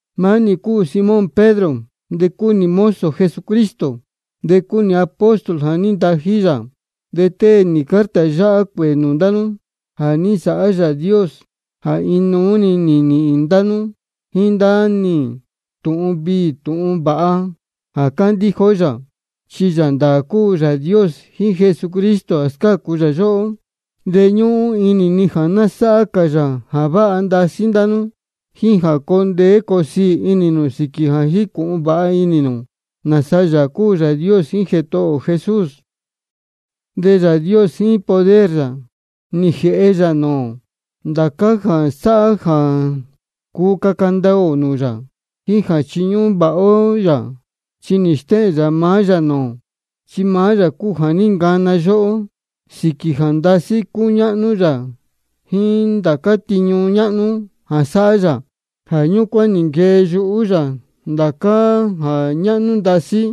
Maá nī cúu Simón Pedro, de cúu nī mozo Jesucristo, de cúu nī apóstol jā ní ntají yā. De tée nī carta yáhá cuēē nūū ndá nú jā ní nsāhá Yāā Dios jā inuú-ni nī nīhīn ndá nú jíín ndá nī tūhun viī tūhun vāha jā cándíja ó yā. Chi Yāā ndāā cúu Yāā Dios jíín Jesucristo jā scácu yóhó. De ñúhún inī ni jā ná sáhá cā yā jā váha ndasí ndá nú, jíín jā coo ndeé coo siī inī nū sīquī jā jícūhun vāha inī nū nāsa Yāā cúu Yāā Dios jíín Jētohō ō Jesús. De Yāā Dios jíín poder yā nī jēhe yā nūū ō ndācá jā sáhá jā cuu caca ndaā ō nūū yā jíín jā chiñúhún vāha ó yā. Chi nī stéhēn yā maá yā nūū ō, chi maá yā cúu jā ní ncana yóhó, sīquī jā ndasí cúñáhnú yā jíín ndācá tiñu ñáhnú jā sáhá yā. Jā ñúcuán nī nquee yuhú yā ndācá jā ñáhnú ndasí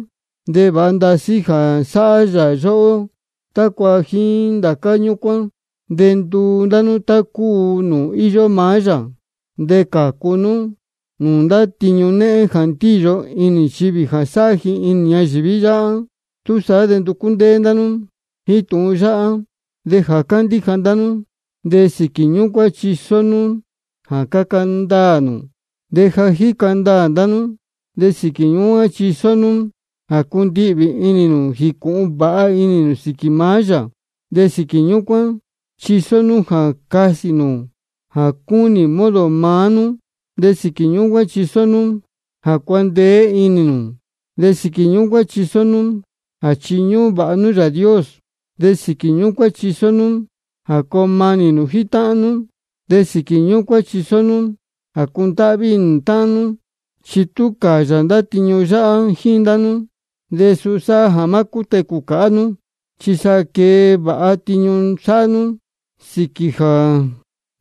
de vāha ndasí jā sáhá yā yóhó, tácua jíín ndācá ñúcuán de nduu ndá nú tá cúu nūū íyó maá yā, de cācu nú nūū ndá tiñu néhén jā ndíyo inī nchivī jā sáhá ji inī ñayīví yáhá. Túsaá de nducú ndéé ndá nú jíín tūhun yáhá. De jā cándíja ndá nú, de sīquī ñúcuán chisó nú jā caca ndaā nū. De jā jíca ndaā ndá nú, de sīquī ñúcuán chisó nú jā cundihvī inī nū jīcūhun vāha inī nū sīquī maá yā. De sīquī ñúcuán chisó nú jā casī nū jā cúnī modo maá nú. De sīquī ñúcuán chisó nú jā cuandeé inī nū, de sīquī ñúcuán chisó nú jā chiñúhún vāha nú Yāā Dios. De sīquī ñúcuán chisó nú jā coo manī nū jíín táhán nú, de sīquī ñúcuán chisó nú jā cundáhví inī nū táhán nú. Chi tú cāyā ndá tiñu yáhá jíín ndá nú, de suu sāhá jā má cútecū cāhá nú, chi sa quee vāha tiñu sáhá nú, sīquī jā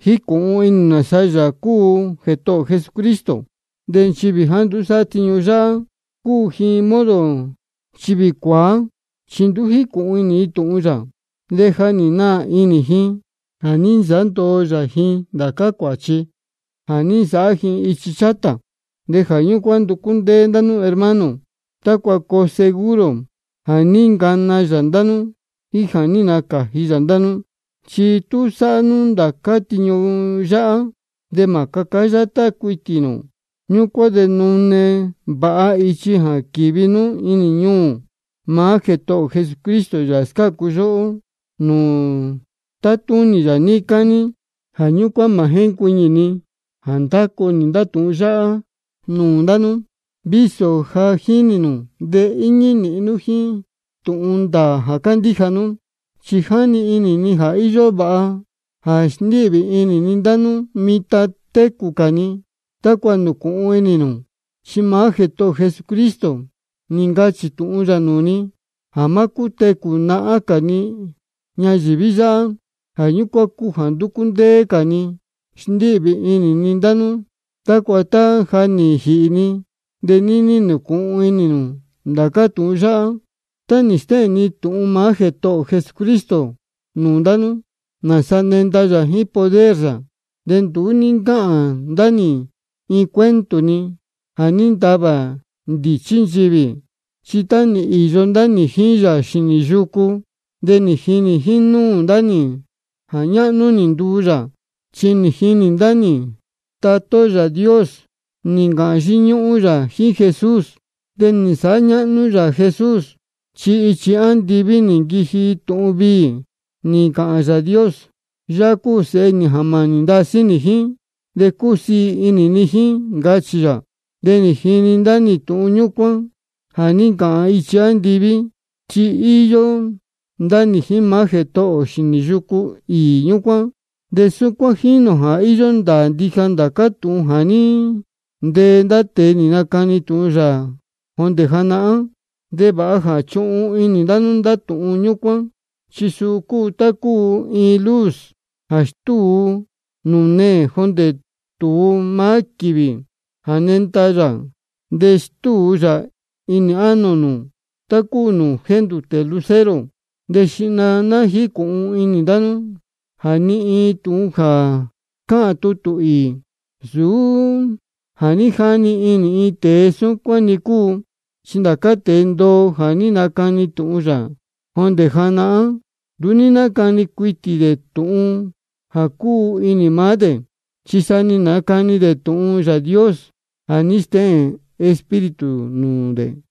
jícūhun inī nū nāsa Yāā cúu Jētohō ō Jesucristo. De nchivī jāá nduú sáhá tiñu yáhá, cúu ji modo nchivī cuāá, chi nduú jícūhun inī ji tūhun yā, de ja nī naā inī ji jā ní nsāhá ndoo yā ji ndācá cuāchi jā ní nsāhá ji ichi chátā. Jā ñúcuán nducú ndéé ndá nú hermano, tácua coo seguro jā ní ncana yā ndá nú jíín jā ní nacāji yā ndá nú. Chi tú sáhá nú ndācá tiñu yáhá, de mā cācá yátá cuitī nū. Ñúcuán de nune vāha ichi jā quīvi nú inī ñuū maá Jētohō ō Jesucristo, Yāā scácu yóhó, nūū tátúnī yā níí cání. Jā ñúcuán mā jéncuiñī ni jā nándacu nī ndá tūhun yáhá nūū ndá nú, vísō ja jínī nū de íñí nīhin nú jíín tūhun ndāā jā cándíja nú. Chi jáni inī ni jā íyó vāha jā sndíhvī inī ni ndá nú mitan técū cā ni, tácua nūcūhun inī nū. Chi maá Jētohō ō Jesucristo nī ncachī tūhun yā nūū ni jā má cútecū nahán cā ni ñayīví yáhá. Jā ñúcuán cúu jā ndúcú ndéé cā ni sndíhvī inī ni ndá nú, tácua tá ja nī jīhī ni, de níní nūcūhun inī nū ndācá tūhun yáhá. Tá nī stéhēn ndá nī tūhun maá Jētohō ō Jesucristo nūū ndá nú, nāsa nenda yā jíín poder yā, de nduú ní ncáhān ndá nī iin cuento-ni jā ní ntavā ndīchí nchivī. Chi tá nī īyo ndá nī jíín yā xīnī yūcú, de nī jinī jínúū ndá nī jā ñáhnú nī nduu yā. Chi nī jinī ndá nī jā Tatá ó Yāā Dios nī ncāhān yíñúhún yā jíín Jesús, de nī nsāhá ñáhnú yā Jesús. Chi ichi andiví nī nquiji tūhun viī, nī ncāhān Yāā Dios: Yáhá cúu Sēhe nī jā mānī ndasí nī jíín, de cúsiī inī ni jíín, ncachī yā. De nī jini ndá nī tūhun ñúcuán jā ní ncāhān ichi andiví, chi nī īyo ndá nī jíín maá Jētohō ō xīnī yucu īī ñúcuán. De súcuán jínī ō jā íyó ndāā ndija ndācá tūhun jā ní ntee ndá tēe nī nacani tūhun yā jondē janahán. De vāha jā chuhun inī ndá nú ndá tūhun ñúcuán, chi suu cúu tá cúu iin luz jā stúu nūū neē, jondē tūu maá quīvī jā nenda yā, de stúu yā inī ánō nū tá cúu nūū jéndūtē lucero. De xihna cā ná jícūhun inī ndá nú jā ni iin tūhun jā cáhān tutū īī, nsūú jā ní jani inī iin tēe súcuán-ni cúu. Chi ndācá tēe ndoo jā ní nacani tūhun yā jondē janahán, nduú ní nácani cuitī dē tūhun jā cúu inī maá dē. Chi sa nī nacani dē tūhun Yāā Dios jā ní stéhēn Espíritu Santo nūū dē.